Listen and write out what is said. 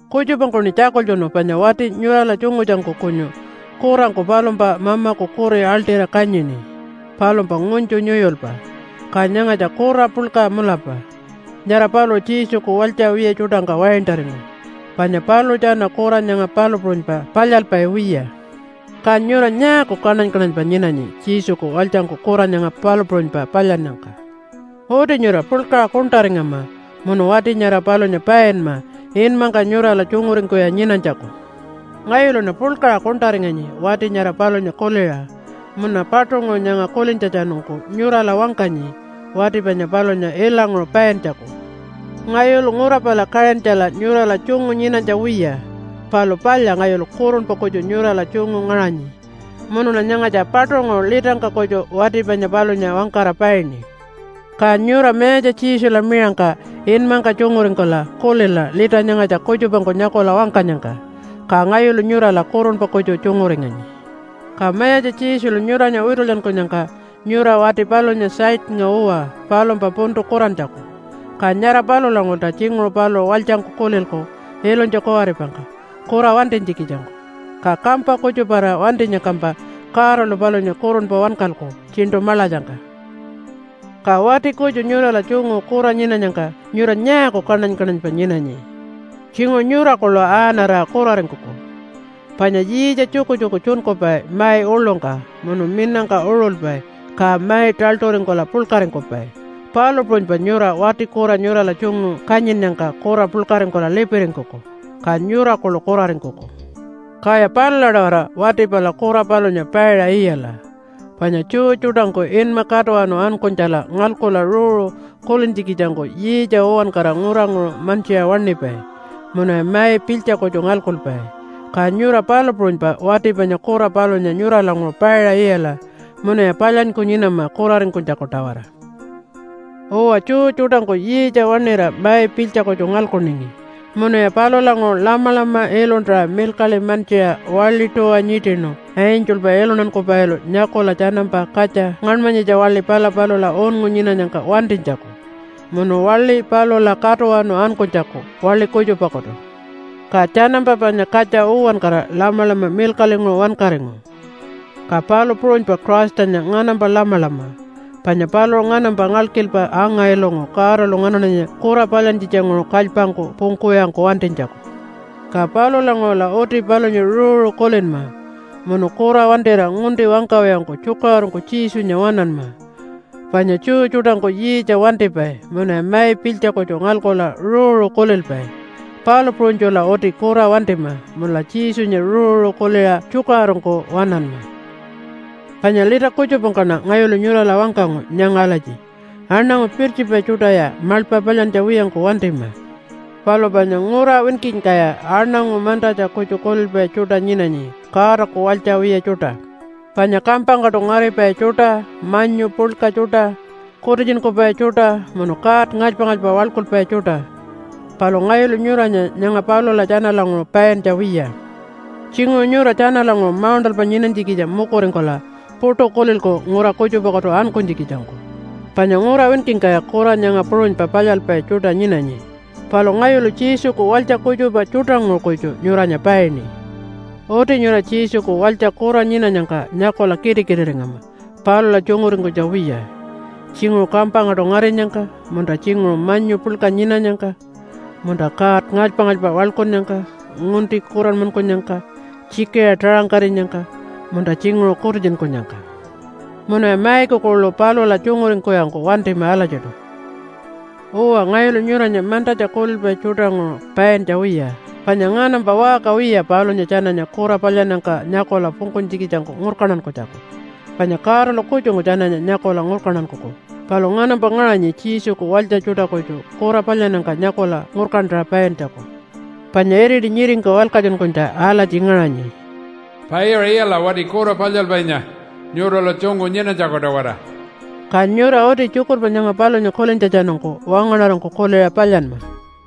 Kutjupangkuṉi tjakultjunu panya wati nyurala tjungutjangku kunyu kurangku palumpa mamaku kuri aḻṯira kanyini, palumpa ngunytju nyuyulpa. Ka nyangatja kura puḻka mulapa. Nyara paluṟu Jesuku walytja wiya tjuṯangka waintaringu panya paluṟu tjana kura nyanga palu puṟunypa palyalpai wiya. Ka nyura nyaaku kaṉany-kaṉanypa nyinanyi Jesuku walytjangku kura nyanga palu puṟunypa palyannyangka? Uti nyura puḻkaṟa kuṉṯaringama munu wati nyara palunya painma inmangka nyurala tjunguringkuwiya nyinanytjaku. Ngayuluṉa puḻkaṟa kuṉṯaringanyi wati nyara palunya kuliṟa, munuṉa paṯunguṟu nyanga kulintjatjanungku nyurala wangkanyi wati panya palunya ilanguṟu paintjaku. Ngayulu ngura pala Kaṟintjala nyurala tjungu nyinanytja wiya, palu palya ngayulu kurunpa kutju nyurala tjungu ngaṟanyi munuṉa nyangatja paṯunguṟu litangka kutju wati panya palunya wangkara paini. Ka nyura Mayatja Jesula miṟangka inmangka tjunguringkula kulila lita nyangatja kutjupangku nyakula wangkanyangka, ka ngayulu nyurala kurunpa kutju tjunguringanyi. Ka Mayatja Jesulu nyuranya witulyankunyangka nyura wati palunya Satannga uwa palumpa puntu kurantjaku, ka nyara palulanguṟulta tjinguṟu paluṟu walytjangku kulilku ilunytja kuwaripangka kura wantinytjikitjangku, ka kampa kutjuparira wantinyangkampa Godalu palunya kurunpa wankalku Tjiṉṯu Maḻatjangka. Ka wati kutju nyurala tjungu kura nyinanyangka nyura nyaaku kaṉany-kaṉanypa nyinanyi? Tjinguṟu nyura kuḻu aaṉarira kuraringkuku. Panya yiitja tjukutjuku tjunkupai mai uḻungka munu minangka uṟulpai ka mai taḻṯuringkula puḻkaringkupai, palu puṟunypa nyura wati kura nyurala tjungu kanyinnyangka kura puḻkaringkula lipiringkuku, ka nyura kuḻu kuraringkuku. Kaya palula-tawara wati pala kura palunya paiṟa iyala. Panya Jew tjuṯangku inma Katuwanu Ankunytjala ngalkula ruuru kulintjikitjangku yiitja uwankara nguranguṟu mantjiṟa waṉipai munuya mai pilytja kutju ngalkupai, ka nyura palu puṟunypa wati panya kura palunya nyuralanguṟu paiṟa iyala munuya palyanyku nyinama kuraringkunytjaku-tawara. Uwa, Jew tjuṯangku yiitja waṉira mai pilytja kutju ngalkuningi, munuya palulanguṟu lamalama iluntaṟa milkaḻi mantjiṟa waḻi tuwa nyiṯinu angelpa iluntankupailu nyakula tjanampa katja ngaṉmanyitja waḻi pala palula unngu nyinanyangka wantinytjaku munu waḻi palula katuwanu ankunytjaku waḻi kutjupakutu. Ka tjanampa panya katja uwankara lamalama milkaḻinguṟu wankaringu. Ka palu puṟunypa Christanya nganampa lamalama, panya paluṟu nganampa ngalkilpa anga-ilungu Godalu nganaṉanya kura palyantjitjanguṟu kalypangku pungkuwiyangku wantinytjaku. Ka palulanguṟula uti palunya ruuru kulinma, munu kura wantira ngunti wangkawiyangku tjukaṟurungku Jesunya waṉanma. Panya Jew tjuṯangku yiitja wantipai munuya mai pilytja kutju ngalkula ruuru kulilpai, palu puṟunytjula uti kura wantima munula Jesunya ruuru kuliṟa tjukaṟurungku waṉanma. Panya lita kutjupangkaṉa ngayulu nyurala wangkangu nyanga alatji, “Aṉangu pirtjipai tjuṯaya maḻpa palyantja wiyangku wantima.” Palu panya ngura winkingkaya aṉangu mantatja kutju kulilpai tjuṯa nyinanyi Godaku walytja wiya tjuṯa, panya kampangkaṯu ngaripai tjuṯa, manyu puḻka tjuṯa, kutitjunkupai tjuṯa, munu god ngalypa-ngalypa waḻkulpai tjuṯa. Palu ngayulu nyuranya nyanga palula tjanalanguṟu paintja wiya. Tjinguṟu nyura tjanalanguṟu mauṉṯalpa nyinanytjikitja mukuringkula puṯu kulilku ngura kutjupakutu ankunytjikitjangku, panya ngura winkingkaya kura nyanga puṟunypa palyalpai tjuṯa nyinanyi. Palu ngayulu Jesuku walytja kutjupa tjuṯanguṟu kutju nyuranya paini. Uti nyura Jesuku walytja kura nyinanyangka nyakula kitikitiringama palula tjunguringkunytja wiya, tjinguṟu kampangkaṯu ngarinyangka, munta tjinguṟu manyu puḻka nyinanyangka, munta god ngalypa-ngalypa waḻkunnyangka, ngunti kuranmankunyangka, tjikiṟa taṟangkarinyangka, munta tjinguṟu kutitjunkunyangka. Munuya maiku kuḻu palula tjunguringkuwiyangku wantima alatjiṯu. Uwa, ngayulu nyuranya mantatja kulilpai tjuṯanguṟu paintja wiya, panya nganampa waṟka wiya palunya tjananya kura palyannyangka nyakula pungkunytjikitjangku ngurkantankunytjaku. Panya Godalu kutjungku tjananya nyakula ngurkantankuku. Palu nganampa ngaṟanyi Jesuku walytja tjuṯa kutju kura palyannyangka nyakula ngurkantaṟa paintjaku. Panya iriti nyiringka walkatjunkunytja alatji ngaṟanyi, “Paiṟa iyala wati kura palyalpainya nyurala tjungu nyinanytjaku-tawara.” Ka nyura uti tjukurpa nyanga palunya kulintjatjanungku wangaṉarangku kuliṟa palyanma.